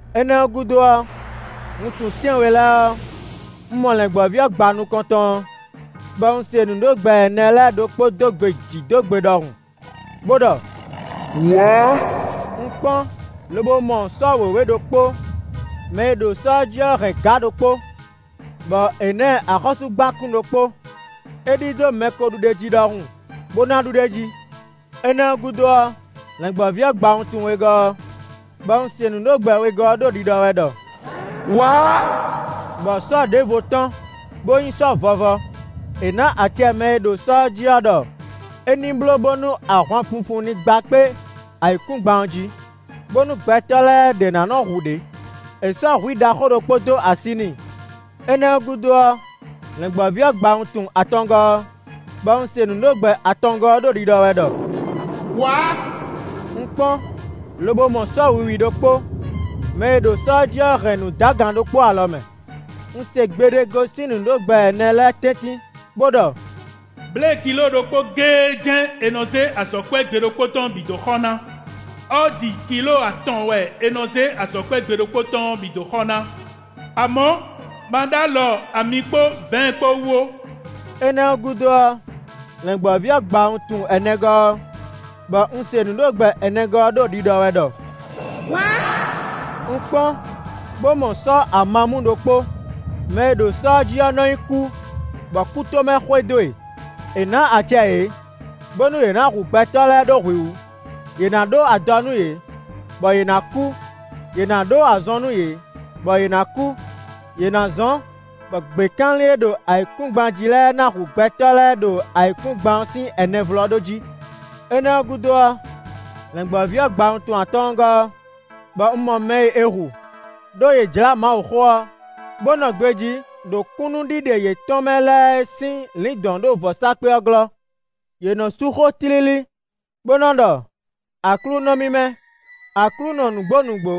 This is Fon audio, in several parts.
Énɛ́ ɔ́ gúdo ɔ́, wuntun tɛ́nwe lɛ́ɛ ɔ́, un mɔ Lɛ̌ngbɔ́ví ɔ́ gba nukɔntɔn ɔ́, bɔ un se nǔɖogbɛ ɛnɛ lɛ́ɛ ɖokpó dó gbe jǐ dó gbe ɖɔhun, bó ɖɔ: “Wǎ!” Un kpɔ́n lobo mɔ sɔ́ wěwé ɖokpó; mɛ e ɖo sɔ́ ɔ́ jí ɔ́ hɛn gǎ ɖokpó, bɔ è nǎ ɛ axɔ́súgbákún ɖokpó. É ɖidó mɛ ko ɖu ɖ'é jí ɖɔhun, bó ná ɖu ɖ'é jí. Énɛ́ ɔ́ gúdo ɔ́, Lɛ̌ngbɔ́ví ɔ́ gba wuntun wegɔ́ ɔ́, bɔ un se nǔɖogbɛ wegɔ́ ɔ́ ɖo ɖiɖɔ wɛ ɖɔ: “Wǎ!” Bɔ sɔ́ ɖěvo tɔ́n, bó nyí sɔ́ vɔvɔ; è nǎ acɛ mɛ e ɖo sɔ́ ɔ́ jí ɔ́ ɖɔ é ní bló bónú ahwanfunfun ní gba kpé ayǐkúngban ɔ́ jí, bónú gbɛtɔ́ lɛ́ɛ ɖě ná nɔ hu ɖě. È sɔ́ hwǐ ɖaxó ɖokpó dó así n'i. Énɛ́ ɔ́ gúdo ɔ́, Lɛ̌ngbɔ́ví ɔ́ gba wuntun atɔngɔ́ ɔ́, bɔ un se nǔɖogbɛ atɔngɔ́ ɔ́ ɖo ɖiɖɔ wɛ ɖɔ: “Wǎ!” Un kpɔ́n, lobo mɔ sɔ́ wiwi ɖokpó; mɛ e ɖo sɔ́ ɔ́ jí ɔ́ hɛn nǔdagan ɖokpó alɔ mɛ. Un se gbe ɖé gosín nǔɖogbɛ ɛnɛ lɛ́ɛ tɛ́ntin, bó ɖɔ: “Blěe kilóo ɖokpó géé jɛ́n è nɔ zé azɔ̌kwɛ́ gbe ɖokpó tɔn ɔ́ bǐ dó xɔ ná; ɔ́ji kilóo atɔn wɛ è nɔ zé azɔ̌kwɛ́ gbe ɖokpó tɔn ɔ́ bǐ dó xɔ ná. Amɔ̌, ma ɖ'alɔ ami kpó vɛ̌ɛn kpó wú ó.” Énɛ́ ɔ́ gúdo ɔ́, Lɛ̌ngbɔ́ví ɔ́ gba wuntun ɛnɛgɔ́ ɔ́, bɔ un se nǔɖogbɛ ɛnɛgɔ́ ɔ́ ɖo ɖiɖɔ wɛ ɖɔ: “Wǎ!” Un kpɔ́n bó mɔ sɔ́ amamú ɖokpó; mɛ e ɖo sɔ́ ɔ́ jí ɔ́ nɔ nyí Kú, bɔ kútomɛ xwedó e. È nǎ acɛ yě, bónú yě ná hu gbɛtɔ́ lɛ́ɛ ɖó hwǐ wú; yě ná ɖó adɔ nú yě, bɔ yě ná kú; yě ná ɖó azɔn nú yě, bɔ yě ná kú; yě ná zɔ́n bɔ gběkanlin e ɖo ayǐkúngban jí lɛ́ɛ ná hu gbɛtɔ́ lɛ́ɛ ɖo ayǐkúngban ɔ́ sín ɛnɛvlɔ́ɖó jí. Énɛ́ ɔ́ gúdo ɔ́, Lɛ̌ngbɔ́ví ɔ́ gba wuntun atɔ́ɔ́ngɔ́ ɔ́, bɔ un mɔ mɛ e è hu, ɖó yě jlá Mawuxó ɔ́, bó nɔ gbejí ɖo kúnnuɖiɖe yětɔn mɛ lɛ́ɛ é sín lǐndɔ̌n ɖo vɔ̌sákpe ɔ́ glɔ́. Yě nɔ sú xó tlílí, bó nɔ ɖɔ: Aklúnɔ mímɛ́, Aklúnɔ nǔgbó nǔgbó,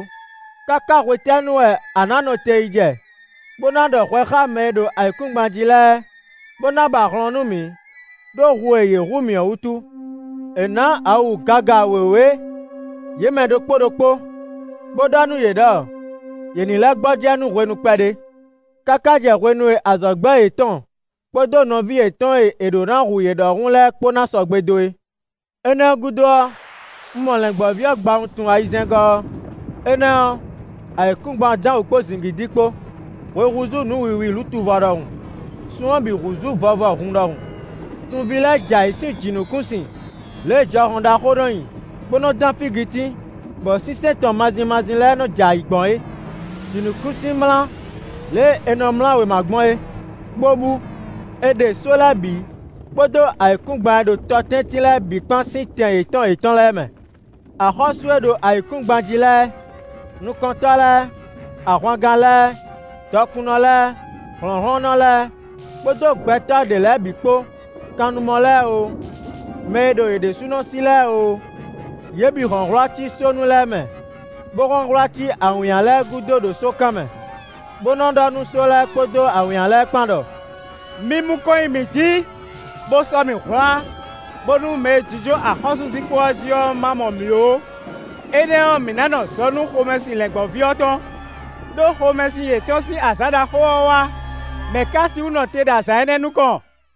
káká hwetɛ́nu wɛ a nǎ nɔ te yi jɛ, bó ná ɖɔ hwɛ xá mɛ e ɖo ayǐkúngban jí lɛ́ɛ, bó ná ba hlɔn nú mǐ, ɖó hu e yě hu mǐ ɔ́ wútu? È nǎ awu gaga wěwé yě mɛ ɖokpó ɖokpó, bó ɖɔ nú yě ɖɔ yě ní lɛ́ gbɔjɛ́ nú hwenu kpɛɖé, káká jɛ hwenu e azɔ̌gbɛ́ yětɔn kpó nɔví yětɔn e è ɖǒ ná hu yě ɖɔhun lɛ́ɛ kpó ná sɔgbe dó é. Énɛ́ ɔ́ gúdo ɔ́, un mɔ Lɛ̌ngbɔ́ví ɔ́ gba wuntun ayizɛ́ngɔ́ ɔ́. Énɛ́ ɔ́, ayǐkúngban dán wǔ kpó zǐngídi kpó, hwe húzú nǔ wiwi lutuvɔ ɖɔhun; sun ɔ́ bǐ húzú vɔvɔ hun ɖɔhun. Sunví lɛ́ɛ jɛ ayǐ sín jǐnukúnsin lě e jɔhɔn ɖaxó nɔ nyi, bó nɔ dán fígitín, bɔ sínsɛ́n tɔn mazin mazin lɛ́ɛ nɔ jɛ ayǐ gbɔn é. Jǐnukúnsin mlá lě e è nɔ mlá wěma gbɔn é, bó bú; è ɖe só lɛ́ɛ bǐ kpódó ayǐkúngban e ɖo tɔ tɛ́ntin lɛ́ɛ bǐ kpán sín tɛn yětɔn yětɔn lɛ́ɛ mɛ. Axɔ́sú e ɖo ayǐkúngban jí lɛ́ɛ, nukɔntɔ́ lɛ́ɛ, ahwangán lɛ́ɛ, dɔkunnɔ lɛ́ɛ, hlɔ̌nhlɔ́nnɔ lɛ́ɛ, kpódó gbɛtɔ́ ɖě lɛ́ɛ bǐ kpó; kannumɔ lɛ́ɛ oo, mɛ e ɖo yě ɖésúnɔ sí lɛ́ɛ oo, yě bǐ hɔn hwlá cí sónu lɛ́ɛ mɛ bó hɔn hwlá cí awǐnnya lɛ́ɛ gúdo ɖo sókan mɛ, bó nɔ ɖɔ nú só lɛ́ɛ kpódó awǐnnya lɛ́ɛ kpán ɖɔ: “Mi mu kɔn nyi mǐ jǐ, bó sɔ́ mǐ hwlá, bónú mɛ e jínjɔ́n axɔ́súzinkpo ɔ́ jí ɔ́ má mɔ mǐ ó; énɛ́ ɔ́, mǐ ná nɔ zɔ nú xomɛsin Lɛ̌ngbɔ́ví ɔ́ tɔn. Đó xomɛsin yětɔn sín azǎn ɖaxó ɔ́ wá; mɛ̌ ka sixú nɔ te ɖo azǎn énɛ́ nukɔn?”